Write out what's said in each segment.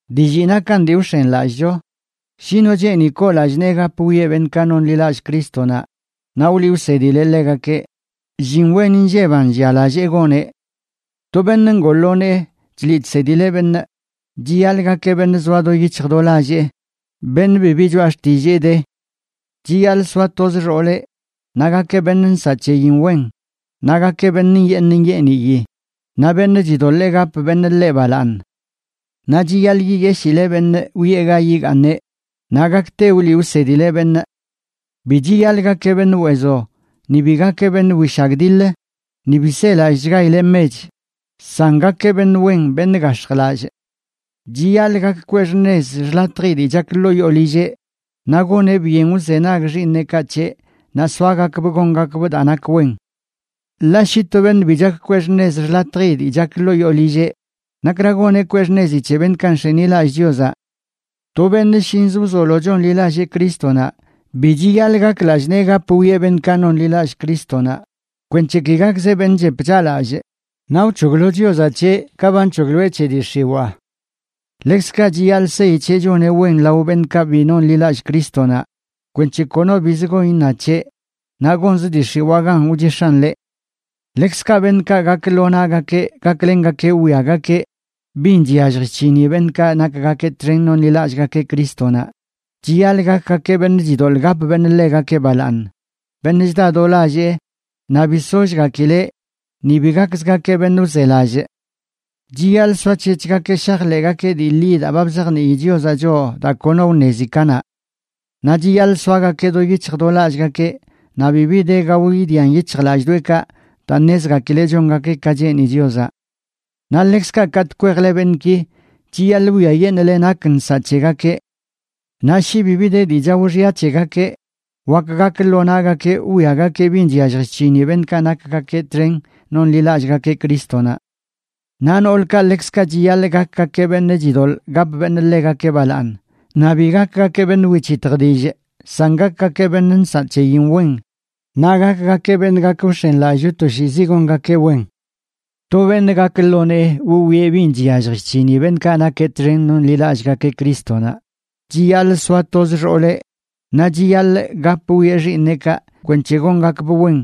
Dillii nakan dii wx̱enlallꞌcho: shi no cheeni koo lallꞌ nee gap wwieꞌ beṉꞌkaꞌ nonḻilallꞌ Crístonaꞌ naꞌ wliꞌ wsedileꞌ ḻegakeꞌ, llin wen inlleban llialallee goneꞌ. To beṉꞌ ngoo ḻoo nee chliꞌ chsedileꞌ beṉꞌ, chiyaḻꞌ gakeꞌ beṉꞌ zoa do yic̱hj do lallee, beṉꞌ bibi choꞌa xtillee de. Chiyaḻꞌ soa toz xooleꞌ, naꞌ gakeꞌ beṉꞌ nsaꞌ c̱heyin wen, naꞌ gakeꞌ beṉꞌ nyeeṉ nyeeniyi, naꞌ beṉꞌ chidoḻee gap beṉꞌ ḻeꞌ balaaṉ. Naꞌ chiyaḻꞌ yiyeshile beṉꞌ wiꞌe ga yigaaṉeꞌ, naꞌ gakte wliꞌ wsedileꞌ beṉꞌ. Bi chiyaḻꞌ gakeꞌ beṉꞌ weezo, ni bi gakeꞌ beṉꞌ wishagdiḻ, ni bi selallꞌchgaileꞌ mech, san gakeꞌ beṉꞌ wen, beṉꞌ gax̱jlallꞌ. Chiyaḻꞌ gak kwee xṉez xḻatji dii chak ḻoo yoo lilleꞌ, naꞌ goneꞌ byen wzenag xiiṉeꞌkaꞌ c̱heꞌ naꞌ soagakbꞌ gongakbꞌ daa nak wen. Ḻaꞌ shi to beṉꞌ bi chak kwee xṉez xḻatji dii chak ḻoo yoo lilleꞌ, ¿nakra goneꞌ kwee xṉezi c̱he beṉꞌkaꞌ nx̱enilallꞌ Chiozaꞌ? To beṉꞌ shinzə wzolo chonḻilallee Crístonaꞌ bi chiyaḻꞌ gak lallꞌ nee gap wwieꞌ beṉꞌkaꞌ nonḻilallꞌ Crístonaꞌ, kwenc̱he ki gakzeꞌ beṉꞌ chep chaꞌlallꞌ naꞌ wc̱hoglo Chiozaꞌ c̱heꞌ ka ba nc̱hogloeꞌ c̱he dii x̱iwaa. Ḻekzkaꞌ chiyaḻꞌ seyi c̱heꞌ choneꞌ wen lao beṉꞌkaꞌ bi nonḻilallꞌ Crístonaꞌ kwenc̱he kono biz gon iṉa c̱heꞌ naꞌ gonzə dii x̱iwaa gan wchix̱an ḻeꞌ. Ḻekzkaꞌ beṉꞌkaꞌ gak lo naꞌgakeꞌ gaklengakeꞌ wwiagakeꞌ bin chyallj chc̱hini beṉꞌkaꞌ nakgakeꞌ txen nonlillꞌgakeꞌ Crístonaꞌ, chiyaḻꞌ gakgakeꞌ beṉꞌ chidoḻꞌ gap beṉꞌ ḻegakeꞌ balaaṉ, beṉꞌ chda do lallee, naꞌ bi sollgakileꞌ, ni bi gakzgakeꞌ beṉꞌ wzelallꞌ. Chiyaḻꞌ soac̱hec̱hgakeꞌ shajḻeꞌgakeꞌ dii ḻi daa ba bzajnii Chiozaꞌ choꞌ daa kono wṉezi kanaꞌ. Naꞌ chiyaḻꞌ soagakeꞌ do yic̱hj do lallꞌgakeꞌ naꞌ bibi de gao idian yic̱hjlallꞌdoꞌekaꞌ daa ṉezgakileꞌ chongakeꞌ ka cheeni Chiozaꞌ. Naꞌ ḻekzkaꞌ katꞌ kwejle beṉꞌki, chiyaḻꞌ wwiayeṉꞌle nak nsaꞌ c̱hegakeꞌ. Naꞌ shi bibi de dii chao xya c̱hegakeꞌ, wak gak lo naꞌgakeꞌ wwiagakeꞌ bin chyallj chc̱hini beṉꞌkaꞌ nakgakeꞌ txen nonlillꞌgakeꞌ Crístonaꞌ. Naꞌ noolkaꞌ ḻekzkaꞌ chiyaḻꞌ gakgakeꞌ beṉꞌ chidoḻꞌ gap beṉꞌ ḻegakeꞌ balaaṉ, naꞌ bi gakgakeꞌ beṉꞌ wic̱hitj dillꞌ, san gakgakeꞌ beṉꞌ nsaꞌ c̱heyin wen, naꞌ gakgakeꞌ beṉꞌ gak wx̱enlallꞌcho toshiizi gongakeꞌ wen. To beṉꞌ gak lo nee wwieꞌ bin chyallj chc̱hini beṉꞌkaꞌ nakeꞌ txen nonlillꞌgakeꞌ Crístonaꞌ chiyaḻꞌ soa toz xooleꞌ, naꞌ chiyaḻꞌ gap wwieꞌ xiiṉeꞌkaꞌ kwenc̱he gongakbꞌ wen,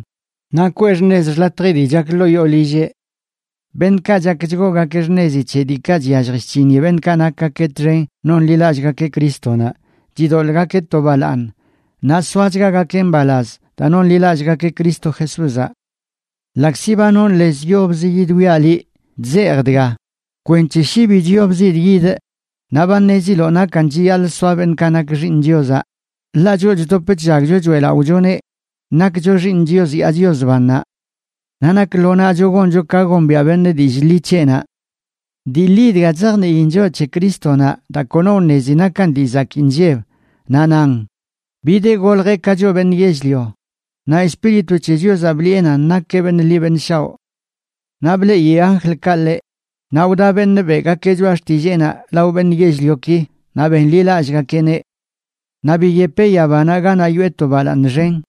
naꞌ kweꞌ xṉez xḻatji dii chak ḻoo yoo lilleꞌ. Beṉꞌkaꞌ chak chgoogakeꞌ xṉezi c̱he diikaꞌ chyallj chc̱hini beṉꞌkaꞌ nakgakeꞌ txen nonlillꞌgakeꞌ Crístonaꞌ chidoḻꞌgakeꞌ to balaaṉ, naꞌ soachgagakeꞌ mbalaz daa nonḻilallꞌgakeꞌ Cristo Jesúzaꞌ. Ḻaꞌkzi ba nonꞌ lez yobzə yidwiaꞌ liꞌ, chzejꞌ dga kwenc̱he shi bi chyobzidꞌ yidꞌ, naꞌ ba ṉeziloꞌ nakan chiyaḻꞌ soa beṉꞌkaꞌ nak xiiṉ Chiozaꞌ, ḻaꞌ choꞌ chdop chllagcho choeꞌlaꞌochoneꞌ nakcho xiiṉ Chios yaa Chios bannaꞌ. Naꞌ nak lo naꞌcho goncho ka gombiaꞌ beṉꞌ dillꞌ ḻi c̱heꞌnaꞌ. Dii ḻi dga chzajniin choꞌ c̱he Crístonaꞌ daa kono wṉezi nakan dii zakii nlleb, naꞌ nan: Bideꞌ goljeꞌ ka choꞌ beṉꞌ yell-lio, naꞌ Espíritu c̱he Chiozaꞌ bliꞌe nan nakeꞌ beṉꞌ ḻi beṉꞌ shaoꞌ. Naꞌ bleꞌi anjlkaꞌ ḻeꞌ, naꞌ wda beṉꞌ beꞌgakeꞌ choꞌa xtilleenaꞌ lao beṉꞌ yell-lioki, naꞌ benḻilallꞌgakeꞌneꞌ. Naꞌ biyepeꞌ yabanaꞌ ganaꞌ yoꞌe to balaaṉ xen.